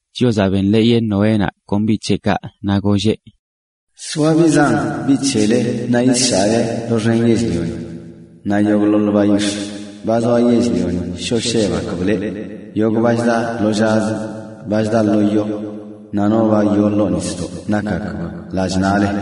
Chiozaꞌ benḻeeyeꞌ Noénaꞌ kon biꞌ c̱heꞌkaꞌ naꞌ golleꞌ: “Soa biꞌ zan biꞌ c̱hele naꞌ yisshaꞌle doxen yell-lioni. Naꞌ yogꞌḻoḻ bayix̱ꞌ, ba zoa yell-lioni shoo shebgakb leꞌ, yogꞌ ba chda lo llazə, ba chda lo yo, naꞌ ba yoo ḻoo nisdoꞌ nakgakb lallꞌ naꞌle.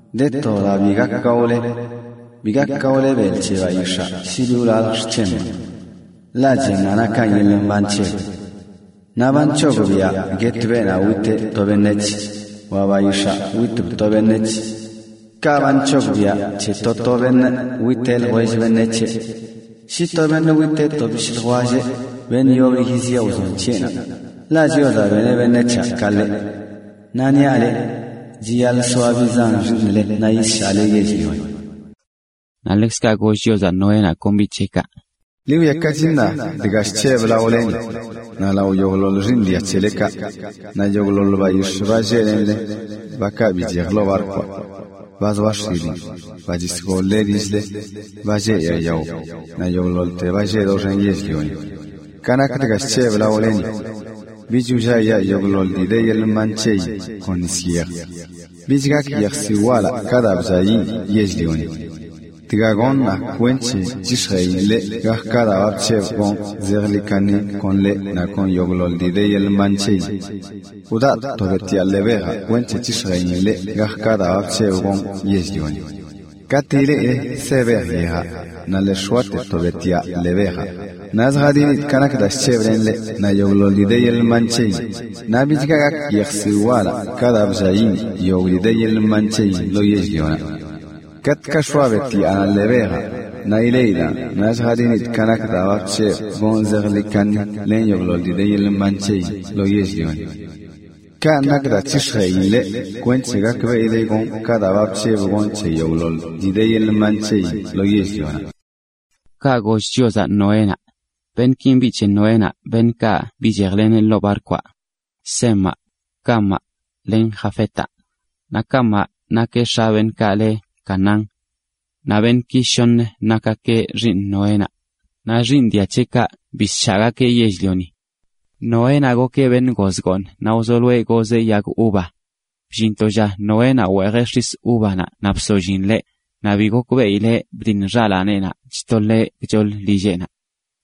Ḻete de to dii bi gak gaole: bi gak gaole belꞌ c̱he bayix̱aa shi bi wlaljle xc̱hemaꞌ. Ḻaꞌ chennaꞌ nakan yeḻꞌ mban c̱heb. Naꞌ ba nc̱hogbiꞌa guet beenaꞌ witeꞌ to beṉec̱h, wa bayix̱aa witb to beṉec̱h. Ka ba nc̱hogbiꞌa c̱he to to beṉꞌ witeꞌ ljwell beṉec̱heꞌnaꞌ. “Shi to beṉꞌ witeꞌ to bishꞌ ljwelleꞌ, beṉꞌ yoblə yiziꞌe wzon c̱heꞌnaꞌ. Ḻaꞌ Chiozaꞌ beneꞌ beṉec̱haꞌ ka ḻeꞌ. Naꞌ niaꞌ leꞌ, chiyaḻꞌ soa biꞌ zan xiiṉle naꞌ yisshaꞌle yell-lioni.” Naꞌ ḻekzkaꞌ goll Chiozaꞌ Noénaꞌ kon biꞌ c̱heꞌkaꞌ: “Ḻi wwiakachi ṉaa dga chc̱hebꞌ laoleni, naꞌ lao yogꞌḻoḻ xiiṉ dia c̱helekaꞌ, naꞌ yogꞌḻoḻ bayix̱ꞌ, ba lleꞌ len leꞌ, bakaꞌ bichej ḻoo barkwaꞌ: ba zoa x̱ilin, ba chisgol-le lill-le, ba lleꞌ yaa yao, naꞌ yogꞌḻoḻte ba lleꞌ doxen yell-lioni. Ka nak dga chc̱hebꞌ laoleni: bich wlliayaa yogꞌḻoḻ dii de yeḻꞌ mban c̱heyin kon nis yej. Bich gak yejsiwꞌ walaꞌ ka daa blliayiꞌn yell-lioni. Dga gonꞌ ṉaa kwenc̱he c̱hix̱jeꞌin leꞌ gak ka daa ba bc̱hebꞌ gonꞌ zejḻi kaṉi kon leꞌ naꞌ kon yogꞌḻoḻ dii de yeḻꞌ mban c̱heyin: wdaꞌ to betyaa ḻee bejaꞌ kwenc̱he c̱hix̱jeꞌin leꞌ gak ka daa ba bc̱hebꞌ gonꞌ yell-lioni. Katꞌ ileꞌile se bej yejaꞌ, naꞌ lii x̱oate to betyaa ḻee bejaꞌ, naꞌ lljadinidꞌ ka nak daa bc̱hebꞌ len leꞌ naꞌ yogꞌḻoḻ dii de yeḻꞌ mban c̱heyin, naꞌ bichga gak yejsiwꞌ walaꞌ ka daa blliayiꞌn yogꞌ dii de yeḻꞌ mban c̱heyin lo yell-lioni. Katꞌkaꞌ x̱oa betyaanaꞌ ḻee bejaꞌ, naꞌ ileꞌidaꞌn naꞌ lljadinidꞌ ka nak daa ba bc̱hebꞌ gonꞌ zejḻi kaṉi len yogꞌḻoḻ dii de yeḻꞌ mban c̱heyin lo yell-lioni. Kaꞌ nak daa c̱hix̱jeꞌin leꞌ kweṉche gakbeꞌile gonꞌ ka daa ba bc̱hebꞌ gonꞌ c̱he yogꞌḻoḻ dii de yeḻꞌ mban c̱heyin lo yell-lioni.” Kaꞌ goll Chiozaꞌ Noénaꞌ. Beṉꞌkin biꞌ c̱he Noénaꞌ beṉꞌkaꞌ bichejleneꞌ ḻoo barkwaꞌ: Semaꞌ, Camaꞌ, len Jafetaꞌ, naꞌ Camaꞌ nakeꞌ x̱a beenaꞌ le Canaán. Naꞌ beṉꞌki shoṉə nakgakeꞌ xiiṉ Noénaꞌ, naꞌ xiiṉ dia c̱heꞌkaꞌ bisshaꞌgakeꞌ yell-lioni. Noénaꞌ gokeꞌ beṉꞌ goz gooṉ naꞌ wzoloeꞌ gozeꞌ yag uva. Bllin to lla Noénaꞌ weejeꞌ x̱is uvanaꞌ naꞌ bsollin ḻeꞌ, naꞌ bi gokbeꞌileꞌ bdiṉ xalaaneꞌnaꞌ chtoḻeꞌ gchoḻ lilleꞌnaꞌ.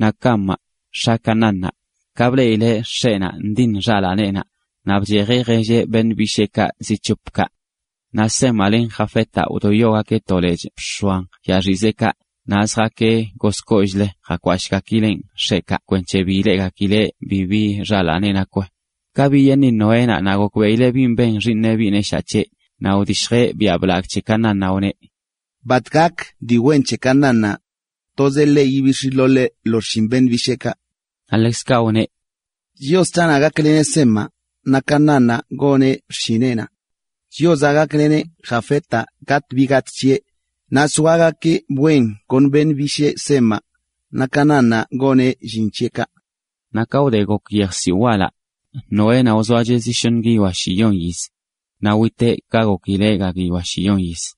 Naꞌ Camaꞌ, x̱a Canaánnaꞌ, ka bleꞌileꞌ x̱eꞌnaꞌ ndiṉ xalaaneꞌnaꞌ, naꞌ bchejeꞌ jelleꞌ beṉꞌ bisheekaꞌ zi c̱hop kaꞌ. Naꞌ Semaꞌ len Jafetaꞌ wdoyogakeꞌ to lechꞌ bx̱oan yaaxizeꞌkaꞌ, naꞌ zjaakeꞌ gozkoollꞌlə jakwashꞌgakileꞌn x̱eꞌkaꞌ kwenc̱he bi ileꞌgakileꞌ bibi xalaaneꞌ nakweꞌ. Ka biyeeṉi Noénaꞌ naꞌ gokbeꞌileꞌ bin ben xiiṉeꞌ biꞌ neshaa c̱heꞌ, naꞌ wdishjeꞌ biaꞌ blagꞌ c̱he Canaánnaꞌ, wneꞌ: “¡Bat gak dii wen c̱he Canaánnaꞌ! Tozeꞌ ḻeꞌ yibix̱ yitoḻeꞌ lo xshin beṉꞌ bisheekaꞌ.” Naꞌ ḻekzkaꞌ wneꞌ: “¡Chios c̱haꞌnaꞌ gakleneꞌ Semaꞌ, naꞌ Canaánnaꞌ goneꞌ xshineꞌnaꞌ! ¡Chiozaꞌ gakleneꞌ Jafetaꞌ gatꞌ bi gatꞌ c̱heꞌ, naꞌ soagakeꞌ wen kon beṉꞌ bishee Semaꞌ, naꞌ Canaánnaꞌ goneꞌ llin c̱heꞌkaꞌ!” Naꞌ ka wde gok yejsiwꞌ walaꞌ, Noénaꞌ wzoacheꞌ zi shoṉə guiyoa shiyon yiz. Naꞌ witeꞌ ka gokileꞌ ga guiyoa shiyon yiz.